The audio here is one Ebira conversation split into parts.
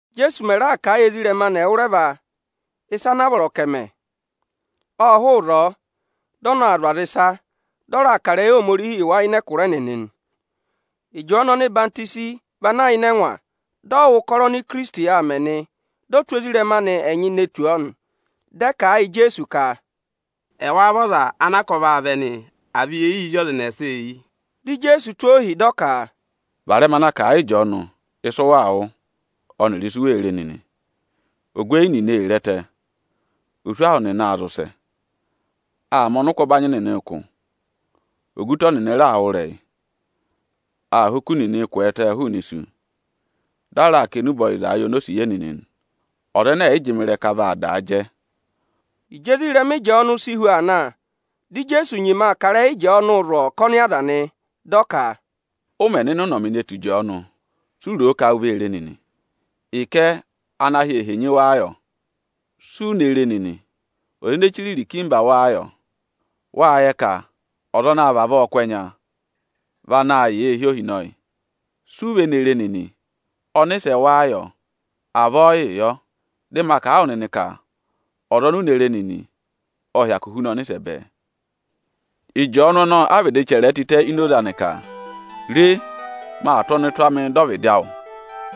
Íjeesu mẹ̀ raà kà a yị ezirẹma anị ẹwụrẹva ịsa anaa vọrọ ka ẹ̀ mẹ, ộ hụụ ịzọọ, dị ọ na aa zụ̀ aza ịsa, dị ọ raa kà ịrẹyị Ohomorihi yị wa ịnị ẹkụra ẹnịnị nị. Ịjọọnụ ọhwọzenyi vị ana yà ịnị ẹngwa, dị ọ wụ́ ụkọrọ oni Ikirisiti aa mẹ nị. Dị ọ tụ́ ezirẹma anị ẹnyị ne tù ọọ nị. Dị ẹ kà a yị Ijeesu ka, “Ẹwáá vị ọza anaa ka ọ vaa vẹ nị, à vị yee yii zí ọza ẹnẹsa eyi?” Dị Ijeesu tụ́ ohi, dị ọ ka, “Varẹma na kà a yii Ịjọọnụ ịsị ụ waa wụ́ ọnịrị ịsị u wee re nịnị! Ogweyi nịnị ee re ẹtẹ, oswahụ nịnị aa zị ụsẹ, aa mẹ ọnịkụ ọbanyị nịnị ụkụ. Ogutọ nịnị raa wụ́ ịrẹyị, aa ha oku nịnị kwẹẹtẹ hụụnị isu. Dị a raa kà enube ọyịza yị onosiye nịnị nị. Ọza ẹnẹ ẹ̀ yị jị mị ịrẹka vaa daa jẹ.” Ịjị ezirẹma Ịjọọnụ si hu aa na, dị Ijeesu nyima aa kà ịrẹyị Ịjọọnụ zụ̀ ọkọnị aza nị. Dị ọ ka, “Ụ mẹ̀ nọ ịnị ụnọmị ne tù Ịjọọnụ, si u ro ka u vee re nịnị? Ịkẹ ana ahị ee henyi wáá yọ? Si u ne re nịnị, ọza ene chire irikimba wáá yọ? Wáa yẹ ka ọza ana àa vavọọ kụ́ ẹnya vị anaā yà eehi ohinọyị. Si u ve ne re nịnị, ọnịsẹ wáá yọ? Avọọ yịị yọ! Dị ma kà a wụ nịnị ka ọza oni u re nịnị, ộ hyakụ huna ọnịsẹ bẹẹ. Ịjọọnụ ọnọọ a vịdị chẹrẹẹ tịtẹ ini oze anị ka: ‘Re, maa tụ́ ọnụtụ amịị dọ ọvịdị awụ,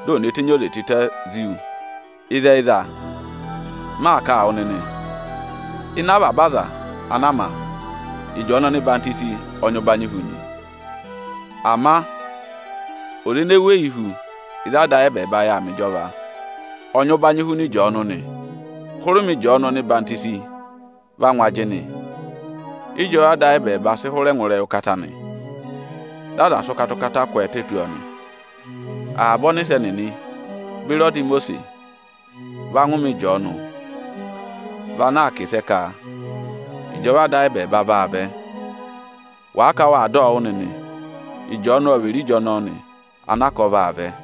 dị ò ne tenyi oze tịtẹ zí wu.’ Ịzẹyịza m maa kà a wụ nịnị nị, ịnị avaba aza anaa ma, Ịjọọnụ ọhwọzenyi ọ nyị ụbanyị hu nị. Ama ọza ene weyi hu ịzị Ada ayị ẹbẹẹba yà aa mẹ ịjọva, ọ nyị ụbanyị hu Ịjọọnụ nị. Hụrẹ ụmẹ Ịjọọnụ ọhwọzenyi va ngụ ajịnị, ịjọva Ada ayị ẹbẹẹba sị hụrẹ ngụ ịrẹyị ụkata nị, dị aza sị ụkata-ụkata kwẹẹtẹ tù ọọ nị. Avaba ọnịsẹ nịnị beri ọda Imosiisi va ngụ ụmẹ Ịjọọnụ vị ana aa kà ịsẹ ka ịjọva Ada ayị ẹbẹẹba vaa vẹ. Wàa ka waa dọ wụ́ nịnị, Ịjọọnụ ọ vị Erija ọnọọ nị anaa ka ọ vaa vẹ.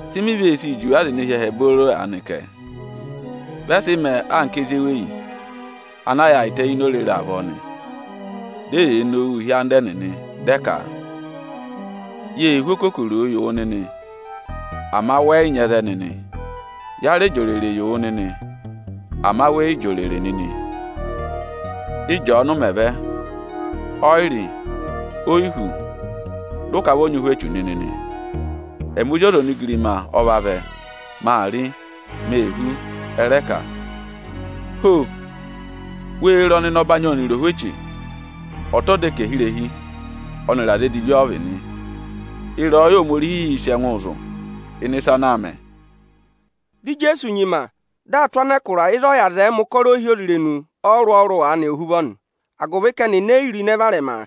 Sị mi ve sii juwe aza ene hi ẹhẹ booro aanị kẹ? Vị ẹ sị mẹẹ anka ezi eweyi ana yaayịtẹ ini orere avọọ nị, dị eyee nowuu hị́ anda ẹnịnị, dị ẹ ka: ‘Yée hú okokoro yị wụ nịnị, ama wẹ yị nyị ẹzẹ nịnị. Ya rẹ jị òrèrè yị wụ nịnị, ama wẹ yị jị òrèrè nịnị!’ Ịjọọnụ mẹ̀ vẹ, ọ yị rị, o yi hú, dị ụ ka vị ọ nyị ụhwẹ echu nịnị nị. Ẹmị Ozi ọza onigirima ọ vavẹ; maa rị, mee hú, ẹ rẹ ka: ‘Ho! Wee re ọnịnọbanyị ọnịrị ohweche! Ọta ọdẹkẹhirehi ọnịrị aza edivi ọ vị nị.’ Ịrẹyọyẹ Ohomorihiī sị ẹngụụ zụ̀ ịnị ịsa ana aa mẹ.” Dị Ijeesu nyima, dị aa tụ́ anẹkụra ịzị ọ yà zẹẹẹ̄ mẹ̀ ụkọrọ ohyozirenu ọrụrụ-ọrụrụ anị ohuvọ agụvị ka ẹnịnị e yi ro ịnẹ varẹma: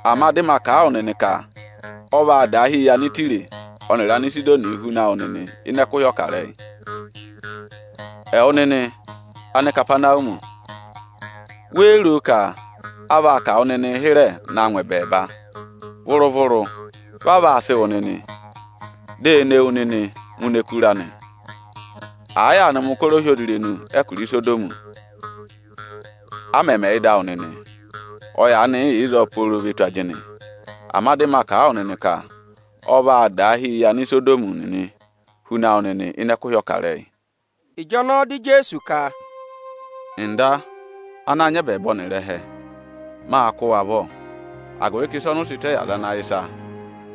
Ama dị ma kà a wụ nịnị ka ọ vaa daahi yị Anịtaya ọnịrị Anisidoni nịnịị huna wụ nịnị ịnị ẹkụhị ọkarẹyị. Ẹwụ nịnị Anikapanawumi, wéé ro ka a vaa kà wụ nịnịị hịrẹ naa ngụ ẹbẹẹba? Vụrụ-vụrụ! Vaa vaa sị wụ nịnị, di e ne wu nịnị ngụ ini ẹkụra nị! Àa yaanị mẹ̀ ụkọrọ ohyozirenu ẹkụra Isodọmị, a mẹ̀ mẹẹ ị́dị awụ nịnị, ọ yaanị yị yà ịzọọ pooro ve tù ajịnị. Ama dị ma kà a wụ nịnị ka ọ vaa daahi yị Anisodọmị nịnị huna wụ nịnị ịnị ẹkụhị ọkarẹyị.” Ịjọnọọ dị Ijeesu ka, “Ọga, ana nyị ẹbẹẹba ọnịrị ẹhẹ! Mâ kụ́ wụ avọ, agụvị ka ịsa ọnị ụ sị tẹ yị aza ana yẹ ịsa,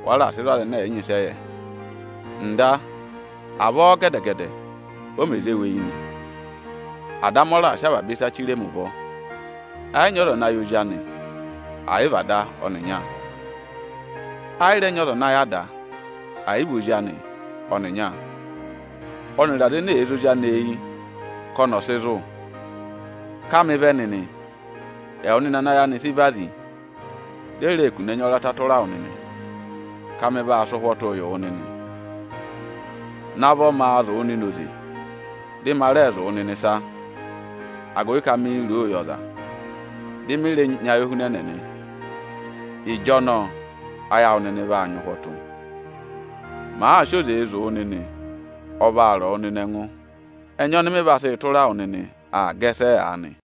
wa raà sị zụ̀ aza ẹnẹ ẹ̀ yị nyị ịsị ẹ yẹ. Ọga, avọọ gẹdẹ-gẹdẹ o mè zé wu eyi nị. Ada amị ọ raà sị avaba ịsa chire mi ụvọ. Ẹ yị nyị ọza ana yẹ Ozi anị, ẹ̀ yị vị Ada ọnịnya. Ẹ yị rẹ nyị ọza ana yẹ Ada, ẹ̀ yị vị Ozi anị ọnịnya ọnịrị aza ene èe zé Ozi anị eyi ka ọnị ọ̀ sị zụ̀. Ká mị vẹ nịnị, ẹwụ nịnị ana ayị anị sị vazi, di e reè kune ẹnya ọrata tụra wụ nịnị, ka mị vaa sị ụhwọtụụ yị wụ nịnị! Navọ maa zụ̀ wụ nịnị oze, dị ma rẹẹ zụ̀ wụ nịnị ịsa; agụvị ka miī ro o yị ọza, dị mị rẹ nyị ayohunẹnẹ nị. Ịjọnọọ ayị awụ nịnị vaa nyị ụhwọtụ. Màa sị oze zụ̀ wụ nịnị, ọ vaa rọ wụ nịnị ẹngụ. Ẹnya ọnị mị vaa sị tụra wụ nịnị aa gẹsẹẹ aanị.”